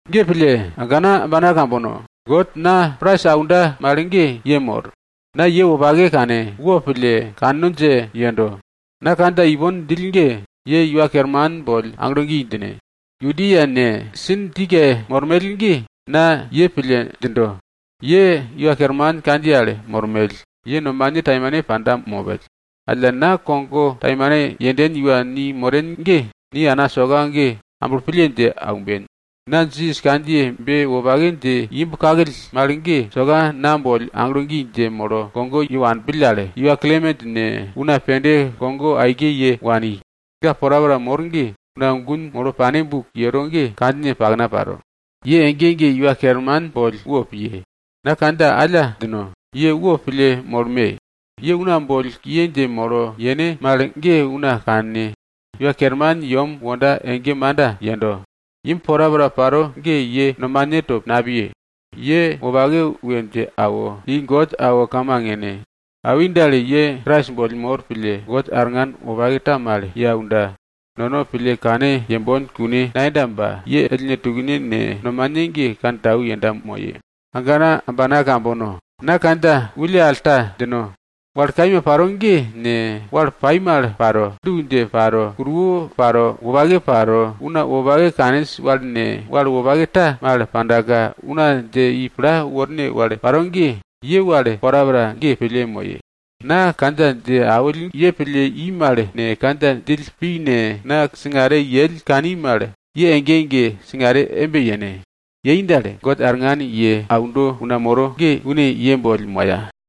Ge pille, agana ambana kambono, God na prais aunda mal ge ye mor. Na ye wopake kane, wo pille, kanno dje yendo. Na kandja ipon djill ge, ye Iwa Kerman boll aglo gi djine. Yuodia ne, Sintike mormell ge na ye pille djindo. Ye Iwa Kerman kandjiye al mormell, ye nomane taimane panda mopell. Alla nono kogo taimane yenmoll iwa ni moren ge, ni ana soka ge amblo pille dje aumben. Na Jisas kandjiyebe wopake dje imb kakill mal ge, soka na boll aglo gi dje molo kogo ye wanpill al, iwa Klemen ne, una pende kogo aike ye wani. Ga porapora mor ge, una gun molo pane buk yero ge kandjine pakna paro. Ye ege ege Iwa Kerman boll wopiye. Na kandja alla djino. Ye wopille molme. Ye una boll kiye dje molo yene mal ge una kanne. Iwa Kerman yem wonda ege manda yendo. Imb porapora paro ge ye nomane to napiye. Ye wopake we dje awo, i God awo kamang yene. Awi dal, ye Krais boll mor pille, God ye arngan wopake ta mal ye aunda, nono pille kane yembon kune nayenda ba, une arngan ye aunda ge, ye ellne tukne ne, nomane ge kantau yenda moye. Agana ambana kambono, na kandja wulle al ta djino. Wal kaima paro ge ne, wal pai mal paro, du dje paro, kuruwo paro, wopake paro, una wopake kaninj wal ne, wal wopake ta mal pandaka una dje i pla worne wal paro ge, ye wal porapora ge pille moye. Na kandja dje awill ye pille i mal ne, kandja djill pi ne, na ye wanill ye kani mal, ye ege ege singare embe yene. Yei dal, God arngan ye aundo una moro ge, une ye boll moya.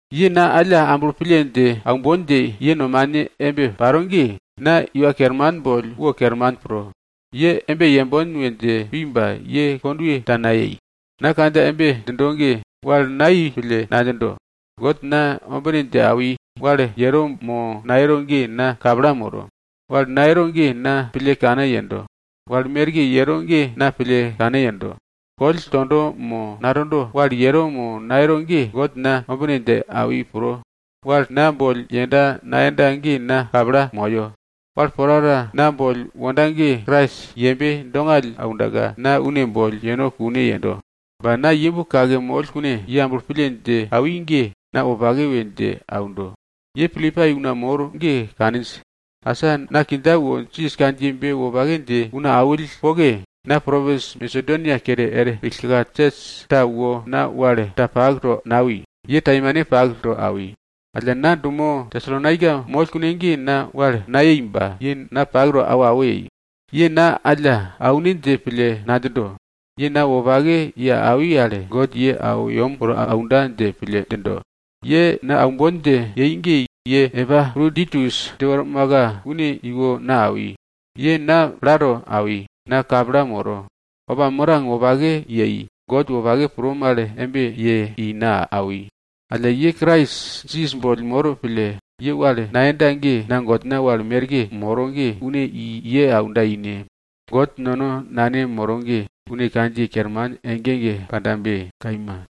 Ye na alla amblo pille dje aumbon dje ye nomane embe paro ge, na Iwa Kerman boll wo kerman pro. Ye embe yembon we dje pi ba ye kondwe ta nayei. Na kandja embe djindo ge, wal nayei pille nadjindo, God na ombine dje awi, wal yero mo nayero ge na kapla moro. Wal nayero ge, na pille kane yendo. Wal merke yero ge, na pille kane yendo. Koll tondo mo natondo, wal yero mo nayero ge, God na ombine dje awi pro, wal na boll yenda nayenda ge na kapla moyo. Wal porapora na boll wonda ge, Krais yembe dongall aundaka, na une boll yeno kune yendo. Ba na imb kake moll kune, ye amblo pille dje awi ge na wopake we dje aundo. Ye Pilipai una mor ge kaninj, asa na kindja wo Jisas kandjiyebe wopake dje una awill poke, na propins Masedonia kere er pillka sios ta wo na wal ta pak to nawi, ye taimane pak to awi. Alla na dumo Tesalonaika moll kune ge na wal nayei ba ye na pak to awo awo yei. Ye na alla aune dje pille nadjindo. Ye na wopake ye awi al, God ye awo yem woro aunda dje pille djindo. Ye na aumbon dje yei ge ye Epaproditus dje wormaka, une iwo na awi. Ye na plato awi, na kapla moro. Opa mirang wopake yei, God wopake pro mal embe ye i na awi. Alla ye Krais Jisas boll mor pille, ye wal nayenda ge, na Godna wal merke moro ge, une i ye aunda ine. God nono Nane moro ge, une kandjiye kerman ege ege pandabe. Kaima.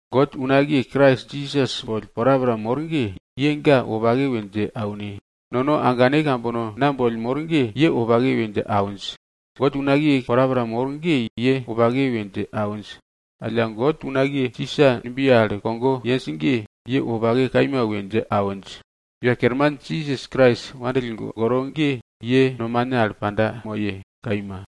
God unakiye Krais Jisas boll porapora mor ge, ye ga wopake we dje aune. Nono agane kambono na boll mor ge ye wopake we dje awinj. God unakiye porapora mor ge ye wopake we dje awinj. Alla, God unakiye Sisa numbiye al kogo yenj ge, ye wopake kaima we dje awinj. Iwa Kerman Jisas Krais nono wopake pille aundo ge ye nomane al panda moye. Kaima.